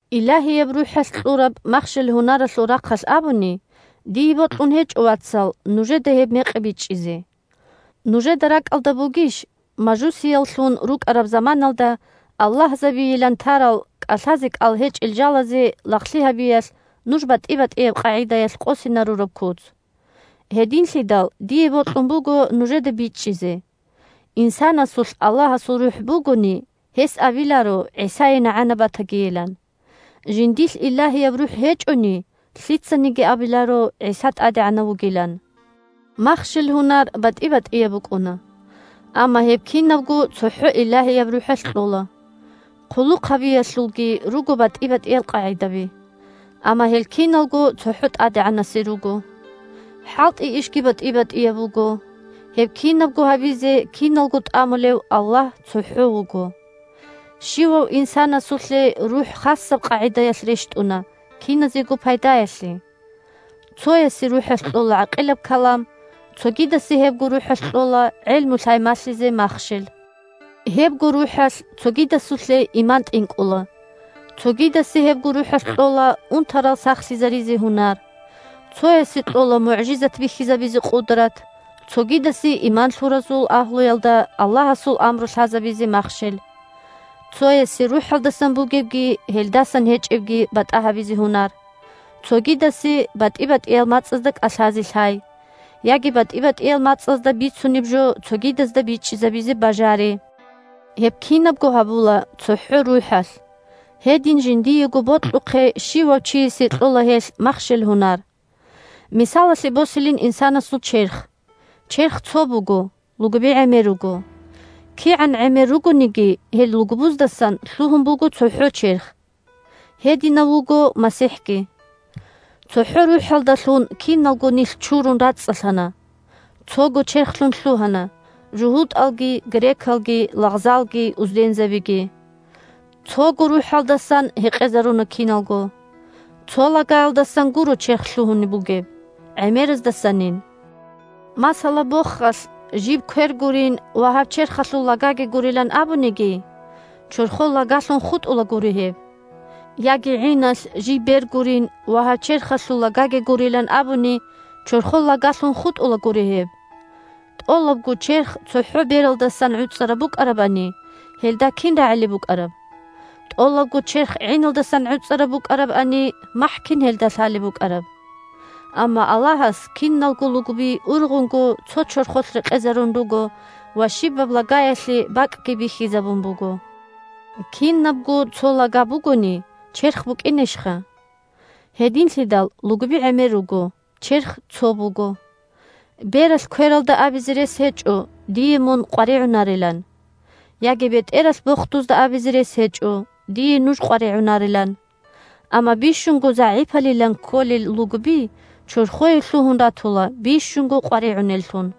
Илагьияб РухӀалъ кьураб махщел-гьунаралъул рахъалъ абуни, дие бокьун гьечӀо, вацал, нужеда гьеб мекъи бичӀчӀизе. Нужеда ракӀалда бугищ, мажусияллъун рукӀараб заманалда аллагьзабийилан тарал, кӀалъазе кӀал гьечӀел жалазе лагълъи гьабиялъ нуж батӀи-батӀияб къагӀидаялъ къосинарураб куц? Гьединлъидал дие бокьун буго нужеда бичӀчӀизе: инсанасулъ Аллагьасул РухӀ бугони, гьес абиларо ГӀисае нагӀана батагийилан. Жиндилъ Илагьияб РухӀ гьечӀони, лъицаниги абиларо ГӀиса ТӀадегӀанав вугилан! Махщел-гьунар батӀи-батӀияб букӀуна. Амма гьеб кинабго цохӀо Илагьияб РухӀалъ кьола. Хъулухъ гьабиялъулги руго батӀи-батӀиял къагӀидаби. Амма гьел киналго цохӀо ТӀадегӀанасе руго. ХӀалтӀи-ишги батӀи-батӀияб буго. Гьеб кинабго гьабизе киналго тӀамулев Аллагь цохӀо вуго. Щивав инсанасулъе РухӀ хасаб къагӀидаялъ рещтӀуна киназего пайдаялъе. Цоясе РухӀалъ кьола гӀакъилаб калам, цогидасе гьебго РухӀалъ кьола гӀелму-лъай малъизе махщел. Гьебго РухӀалъ цогидасулъе иман тӀинкӀула, цогидасе гьебго РухӀалъ кьола унтарал сахлъизаризе гьунар; цоясе кьола мугӀжизат бихьизабизе къудрат, цогидасе – иман лъуразул агьлуялда Аллагьасул амру лъазабизе махщел; цоясе – РухӀалдасан бугебги гьелдасан гьечӀебги батӀа гьабизе гьунар, цогидасе – батӀи-батӀиял мацӀазда кӀалъазе лъай, яги батӀи-батӀиял мацӀазда бицунеб жо цогидазда бичӀчӀизабе бажари. Гьеб кинабго гьабула цохӀо РухӀалъ, гьедин жиндиего бокьухъе щивав чиясе кьола гьелъ махщел-гьунар. Мисалалъе босилин инсанасул черх. Черх цо буго, лугби гӀемер руго. КигӀан гӀемер ругониги гьел лугбуздасан лъугьун буго цохӀо черх. Гьединав вуго МасихӀги. ЦохӀо РухӀалдалъун киналго нилъ чурун рацӀцӀалъана, цого черхлъун лъугьана – жугьутӀалги, грекалги, лагъзалги, уздензабиги. Цого РухӀалдасан гьекъезаруна киналго. Цо лагаялдасан гуро черх лъугьун бугеб, гӀемераздасанин. Масала, бохалъ жиб квер гурин ва гьаб черхалъул лагаги гурилан абуниги, чорхол лагалъун хутӀулагури гьеб. Яги гӀиналъ жиб бер гурин ва гьаб черхалъул лагаги гурилан абуни, чорхол лагалъун хутӀулагури гьеб. ТӀолабго черх цохӀо бералдасан гӀуцӀараб букӀарабани, гьелда кин рагӀилеб букӀараб? ТӀолабго черх гӀиналдасан гӀуцӀараб букӀарабани, махӀ кин гьелда лъалеб букӀараб? Амма Аллагьас киналго лугби ургъунго цо чорхолъ рекъезарун руго ва щибаб лагаялъе бакӀги бихьизабун буго. Кинабго цо лага бугони, черх букӀинищха. Гьединлъидал лугби гӀемер руго, черх цо буго. Бералъ квералда абизе рес гьечӀо дие мун къваригӀунарилан. Яги бетӀералъ бохдузда абизе рес гьечӀо дие нуж къваригӀунарилан. Амма бищунго загӀипалилан кколел лугби чорхое лъугьун ратула бищунго къваригӀунеллъун.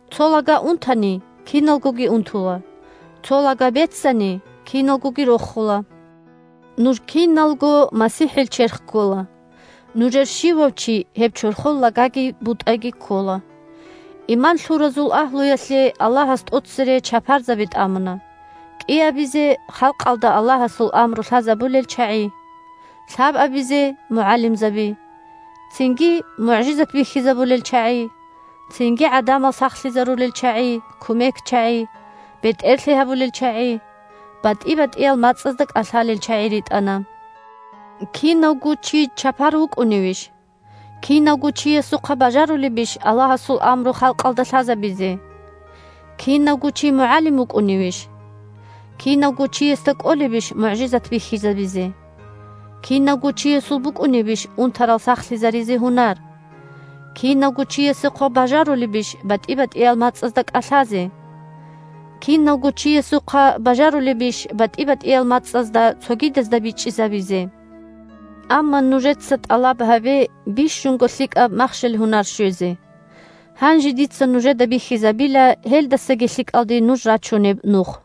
Цо лага унтани, киналгоги унтула. Цо лага беццани, киналгоги рохула. Нуж киналго МасихӀил черх ккола. Нужер щивав чи гьеб чорхол лагаги бутӀаги ккола. Иман лъуразул агьлуялъе Аллагьас тӀоцере чапарзаби тӀамуна, кӀиабизе – халкъалда Аллагьасул амру лъазабулел чагӀи, лъабабизе – мугӀалимзаби, цинги мугӀжизат бихьизабулел чагӀи, цинги гӀадамал сахлъизарулел чагӀи, кумекчагӀи, бетӀерлъи гьабулел чагӀи, батӀи-батӀиял мацӀазда кӀалъалел чагӀи ритӀана. Кинавго чи чапар вукӀуневищ? Кинавго чиясухъа бажарулебищ Аллагьасул амру халкъалда лъазабизе? Кинавго чи мугӀалим вукӀуневищ? Кинавго чиясда кӀолебищ мугӀжизат бихьизабизе? Кинавго чиясул букӀунебищ унтарал сахлъизаризе гьунар? Кинавго чиясухъа бажарулебищ батӀи-батӀиял мацӀазда кӀалъазе? Кинавго чиясухъа бажарулебищ батӀи-батӀиял мацӀазда цогидазда бичӀчӀизабизе? Амма нужеца тӀалаб гьабе бищунго лъикӀаб махщел-гьунар щвезе. Гьанже дица нужеда бихьизабила гьелдасаги лъикӀалде нуж рачунеб нух.